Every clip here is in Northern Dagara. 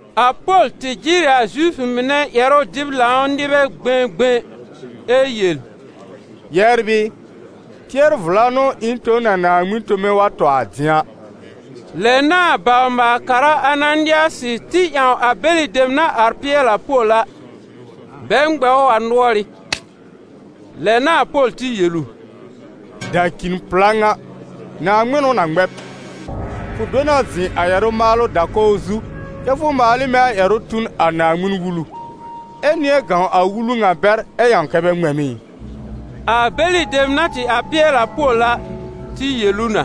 A Pol tɩ jɩr ɩ a Zifʋ mɩnɛ ƴɛrʋ-dɩb-lãw nɩbɛ gbẽgbẽ ɛ yel: «Yɛbr ɩ, tɩɛr-vla n'ʋ ɩ̃ tõ n a Naaŋmɩn tome wa tɔ a dɩ̃a.» Lɛ n'a a bawr-maal-kara Ananɩasɩ tɩ ƴãw a bɛlɩ dem na ar pɩɛlɩ a Pol a, bɛ ŋmɛ ʋ a nʋɔrɩ́. Lɛ n'a a Pol tɩ yel ʋ: «Dacĩ-pla ŋa! Naaŋmɩn n'ʋ na ŋmɛ b. Fʋ do na zɩ̃ a ƴɛrʋ-maalʋ da-kɔw zu kɛ́ fʋ maal ɩ mɛ̃ a ƴɛrʋ tu n a Naaŋmɩn-Wulu, ɛ nɩ̃ɛ gãw a Wulu ŋa bɛr ɛ ƴãw kɛ́ bɛ ŋmɛ m ɩ?» A bɛlɩ dem na tɩ ar pɩɛlɩ a Pol a tɩ yel ʋ na: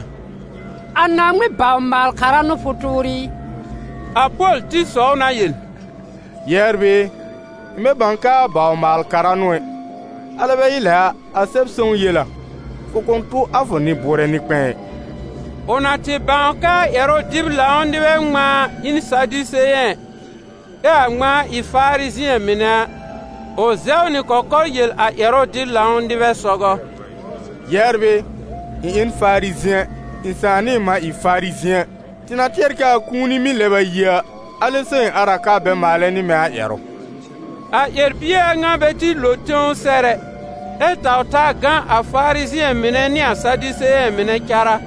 «A Naaŋmɩn bawr-maal-kara n'ʋ fʋ tʋʋr ɩ?» A Pol tɩ sɔw na yel: «Yɛbr ɩ, ɩ̃ bɛ bãw kɛ a bawr-maal-kara n'ʋ ɛ. Alɛ bɛ ɩ lɛ a, a Sɛb-sõw yel a: ‹Fʋ kʋ̃ tʋ a fʋ nɩ-bʋʋrɛ nɩ-kpɛ̃ɛ ɩ.›» Ʋ na tɩ bãw kɛ a ƴɛrʋ-dɩb-lãw nɩbɛ ŋmãa ɩ n Sadiseyɛ̃, ɛ a ŋmãa ɩ Farizɩ̃ɛ mɩnɛ a, ʋ zɛw nɩ kɔkɔr yel a ƴɛrʋ-dɩb-lãw nɩbɛ sɔgɔ: «Yɛbr ɩ, ɩ̃ ɩ n Farizɩ̃ɛ, ɩ̃ sãà nɩ ɩ̃ mã ɩ Farizɩ̃ɛ. Tɩ na tɩɛrɛ kɛ a kũuni mɩ́ lɛb a yi a, alɛ so ɩ̃ ar a ka bɛ maalɛ nɩ mɛ̃ a ƴɛrʋ.» A ƴɛr-bie a ŋa bɛ tɩ lo tẽw sɛr ɛ, ɛ taw-taa gã a Farizɩ̃ɛ mɩnɛ nɩ a Sadiseyɛ̃ mɩnɛ cárá,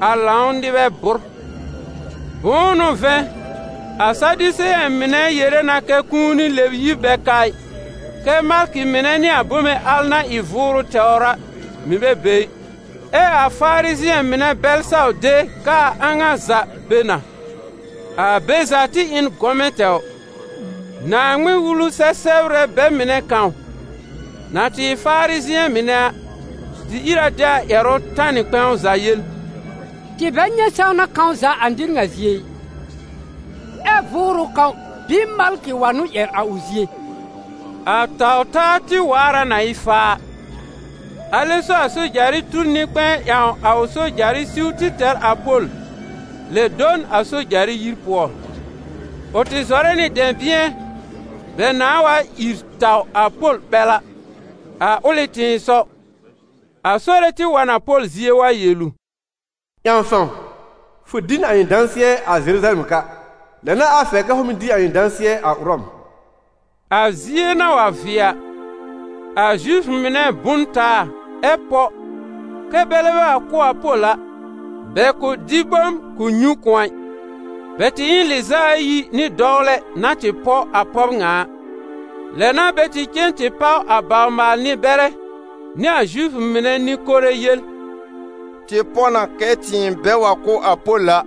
a lãw nɩbɛ bʋ́r. Bʋ̃ʋ n'ʋ vɛ̃, a Sadiseyɛ̃ mɩnɛ yere na kɛ́ kũuni lɛb-yib bɛ ka ɩ, kɛ́ malkɩ mɩnɛ nɩ a bome al na ɩ vʋʋrʋ tɛwr a mɩ̀ bɛ be ɩ. Ɛ a Farizɩ̃ɛ mɩnɛ bɛl saw de kɛ a a ŋa za be na. A be za tɩ ɩ n gɔmɛ tɛwr. Naaŋmɩn-Wulu-sɛ-sɛbrbɛ bɛ mɩnɛ kãw, na tɩ ɩ Farizɩ̃ɛ mɩnɛ a, tɩ ìr a de a ƴɛrʋ tanɩ kpɛ̃w za yel: «Tɩ bɛ nyɛ̃ sãwna kãw za a nɩr ŋa zie ɩ. Ɛ vʋʋrʋ kãw bɩɩ malkɩ wa n'ʋ ƴɛr a ʋ zie?» A taw-taa tɩ waar a na ɩ faa, alɛ so a sojarɩ tur nɩ-kpɛ̃ɛ ƴãw a ʋ sojarɩ siw tɩ tɛr a Pol lɛ do n a sojarɩ yir pʋɔ. Ʋ tɩ zɔrɛ nɩ dɛ̃bɩ̃ɛ bɛ nãa wa ìr taw a Pol ɓɛl a. A ʋlɩ tɩ̃ɩsɔw, a Sore tɩ wa n a Pol zie wa yel ʋ: «Ƴãw fãw! Fʋ dɩ n a ɩ̃ dãsɩɛ a Zeruzalɛm ka. Lɛ n'a a fɛr kɛ fʋ mɩ̀ dɩ a ɩ̃ dãsɩɛ a Ʋrɔm.» A zie na wa vɩɛ a, a Zifʋ mɩnɛ bʋ n taa ɛ pɔ kɛ́ bɛlɛ bɛ wa kʋ́ a Pol a, bɛ kʋ̃ dɩ bom kʋ̃ nyũ kʋ̃ɔ ɩ. Bɛ tɩ ɩ n lɩz'a ayi nɩ dɔwlɛ na tɩ pɔ a pɔb ŋa a. Lɛ n'a bɛ tɩ cen tɩ páw a bawr-maal-nɩ-bɛrɛ nɩ a Zifʋ mɩnɛ nɩ-kore yel: «Tɩ pɔ na kɛ tɩɩm bɛ wa kʋ́ a Pol a,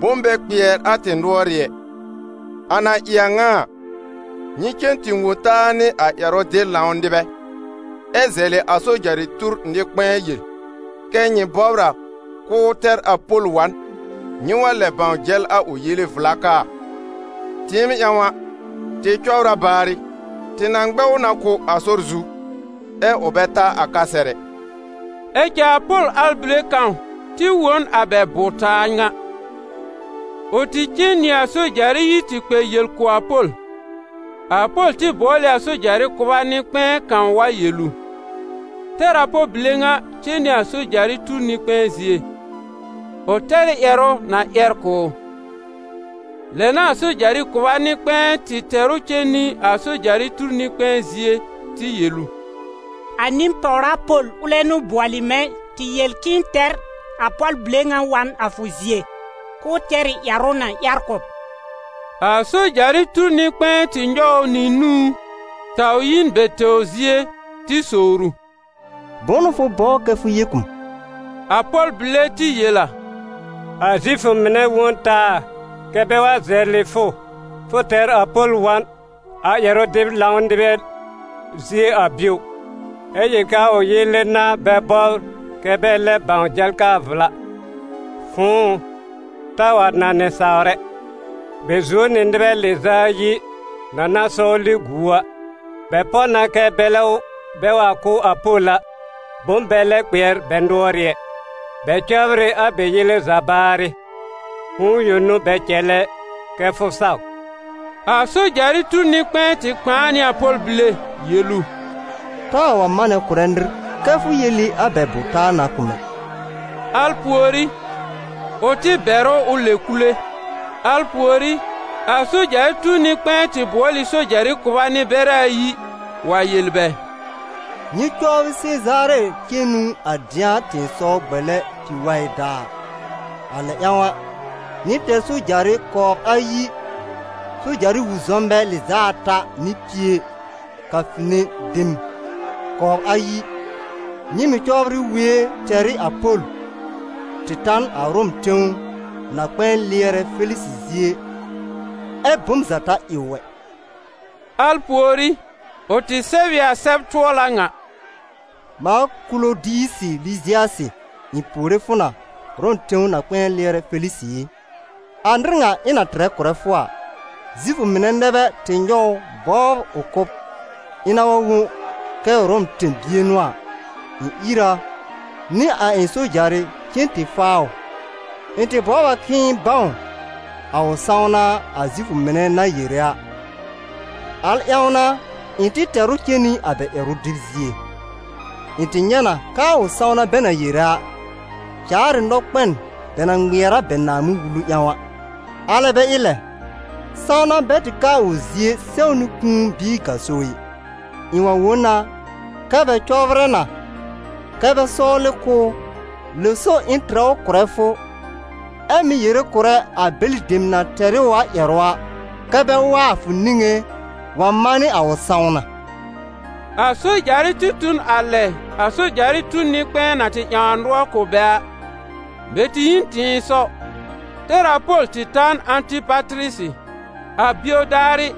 bom bɛ kpɩɛr a tɩ nʋɔrɩ́ ɛ. A na ɩ a ŋa a, nyɩ cen tɩ wõ taa nɩ a ƴɛrʋ-dɩb-lãw nɩbɛ, ɛ zɛlɩ a sojarɩ tur nɩ-kpɛ̃ɛ yel kɛ nyɩ bɔbr a k'ʋʋ tɛr a Pol wa n, nyɩ wa lɛ bãw jɛl a ʋ yele vla kaa a. Tɩɩm ƴãw a, tɩ cɔbr a baarɩ, tɩ na ŋmɛ ʋ na kʋ́ a sɔr zu, ɛ ʋ bɛ ta a ka sɛr ɛ.» Ɛ cɛ a Pol arbile kãw tɩ wõ n a bɛ bʋ-taa ŋa. Ʋ tɩ cen nɩ a sojarɩ yir tɩ kpɛ yel kʋ̀ a Pol. A Pol tɩ bʋɔl ɩ a sojarɩ kʋba nɩ-kpɛ̃ɛ kãw wa yel ʋ: «Tɛr a pɔl bile ŋa cen nɩ a sojarɩ tur nɩ-kpɛ̃ɛ zie, ʋ tɛr ɩ ƴɛrʋ na ƴɛr kʋ̀ ʋ.» Lɛ n'a a sojarɩ kʋba nɩ-kpɛ̃ɛ tɩ tɛr ʋ cen nɩ a sojarɩ tur nɩ-kpɛ̃ɛ zie tɩ yel ʋ: «A nɩ-pàwra Pol, ʋlɛ n'ʋ bʋɔlɩ mɛ̃ tɩ yel k'ɩ̃ɩ tɛr a pɔl bile ŋa wa n a fʋ zie, k'ʋʋ tɛr ɩ ƴɛrʋ na ƴɛr kʋ̀ b.» A sojarɩ tur nɩ-kpɛ̃ɛ tɩ nyɔw ʋ nɩ nũú, taw yi n bɛ tɛwr zie tɩ sowr ʋ: «Bʋ̃ʋ n'ʋ fʋ bɔbr kɛ fʋ yel kʋ̀ m?» A pɔl bile tɩ yel a: «A Zifʋ mɩnɛ wõ n taa, kɛ́ bɛ wa zɛlɩ fʋ tɛr a Pol wa n a ƴɛrʋ-dɩb-lãw nɩbɛ zie a bio, ɛ yel k'aa ʋ yele n'a bɛ bɔbr kɛ bɛ lɛb bãw jɛl kaa vla. Fʋ̃ʋ ʋ, taa wa nãnɩ sawr ɛ. Bɛ zuo nɩ nɩbɛ lɩz'a ayi na na sɔwlɩ gu ʋ a. Bɛ pɔ na kɛ́ bɛlɛ bɛ wa kʋ́ a Pol a, bom bɛ lɛ kpɩɛr bɛ nʋɔrɩ́ ɛ. Bɛ cɔbr ɩ a bɛ yele za baarɩ, fʋ̃ʋ yõ n'ʋ bɛ cɛlɛ kɛ fʋ saw.» A sojarɩ tur nɩ-kpɛ̃ɛ tɩ kpãa nɩ a pɔl bile yel ʋ: «Taa wa manɛ kʋ̀rɛ nɩr kɛ́ fʋ yel ɩ a bɛ bʋ-taa ŋa kʋ̀ m ɛ!» Al pùorí, ʋ tɩ bɛr ʋ ʋ lɛb kule. Al pùorí, a sojarɩ tur nɩ-kpɛ̃ɛ tɩ bʋɔl ɩ sojarɩ kʋba nɩ-bɛrɛ ayi wa yel bɛ: «Nyɩ cɔbrɩ Sezaare cenu a dɩ̃a tɩ̃ɩsɔw gbele pi-waɩ daar. A lɛ ƴãw, nyɩ tɛr sojarɩ kɔbr ayi, soja-wi-zɔmnbɛ lɩz'a ata nɩ pie, kafine dem kɔbr ayi. Nyɩ mɩ̀ cɔbrɩ wue tɛr ɩ a Pol tɩ ta n a Ʋrɔm tẽw na-kpɛ̃ɛ lɩɛrɛ Felisɩ zie, ɛ́ bom za ta ɩ ʋ ɛ.» Al pùorí, ʋ tɩ sɛb ɩ a sɛb-tʋɔla ŋa: «Mãa Kulodiyisɩ Lɩzɩasɩ, ɩ̃ puore fʋ na, Ʋrɔm tẽw na-kpɛ̃ɛ lɩɛrɛ Felisɩ ɩ! A nɩr ŋa ɩ̃ na tɩrɛ kʋ̀rɛ fʋ a, Zifʋ mɩnɛ nɛ bɛ tɩ nyɔw ʋ bɔbr ʋ kʋ́b. Ɩ̃ na wa wõ kɛ Ʋrɔm tẽ-bie n'ʋ a, ɩ̃ ìr a nɩ a ɩ̃ sojarɩ cen tɩ faa ʋ. Ɩ̃ tɩ bɔbr a k'ɩ̃ɩ bãw a ʋ sãwna a Zifʋ mɩnɛ na yere a, al ƴãw n'a ɩ̃ tɩ tɛr ʋ cen nɩ a bɛ ƴɛrʋ dɩb zie. Ɩ̃ tɩ nyɛ̃ na kɛ a ʋ sãwna bɛ na yere a, caar ɩ nɔkpɛn bɛ na ŋmɩɛr a bɛ Naaŋmɩn-Wulu ƴãw a, alɛ bɛ ɩ lɛ, sãwna bɛ tɩ ka a ʋ zie sɛw nɩ kũu bɩɩ gaso ɩ. Ɩ̃ wa wõ na kɛ́ bɛ cɔbrɛ na kɛ́ bɛ sɔwlɩ kʋ́ ʋ. Lɛ so ɩ̃ tɩrɛ ʋ kʋ̀rɛ fʋ, ɛ mɩ̀ yere kʋ̀rɛ a bɛlɩ dem na tɛr ɩ ʋ a ƴɛrʋ a, kɛ́ bɛ wa a fʋ niŋé wa manɩ a ʋ sãwna.» A sojarɩ tɩ tu n a lɛ a sojarɩ tur nɩ-kpɛ̃ɛ na tɩ ƴãw a nʋɔr kʋ̀ bɛ a. Bɛ tɩ yi n tɩ̃ɩsɔw tɛr a Pol tɩ ta n Ãtɩpatɩrɩsɩ. A bio daarɩ,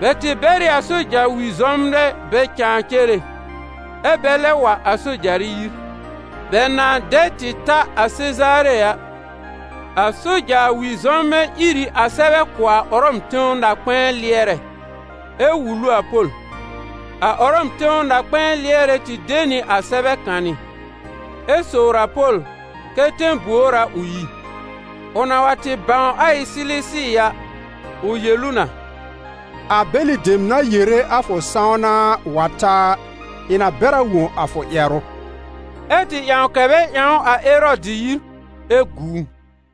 bɛ tɩ bɛr ɩ a soja-wi-zɔmnbɛ bɛ cãa cere, ɛ́ bɛ lɛb wa a sojarɩ yir. Bɛ na dɛ tɩ ta a Sezaare a, a soja-wi-zɔmnbɛ ír ɩ a sɛbɛ kʋ̀ a Ʋrɔm tẽw na-kpɛ̃ɛ lɩɛrɛ, ɛ wul ʋ a Pol. A Ʋrɔm tẽw na-kpɛ̃ɛ lɩɛrɛ tɩ de nɩ a sɛbɛ kanɩ, ɛ sowr a Pol kɛ tẽ-buor a ʋ yi. Ʋ na wa tɩ bãw a ɩ Silisi a, ʋ yel ʋ na: «A bɛlɩ dem na yere a fʋ sãwna a wa ta a, ɩ̃ na bɛr a wõ a fʋ ƴɛrʋ.» Ɛ́ tɩ ƴãw kɛ bɛ ƴãw ʋ a Erɔdɩ yir, ɛ gu ʋ.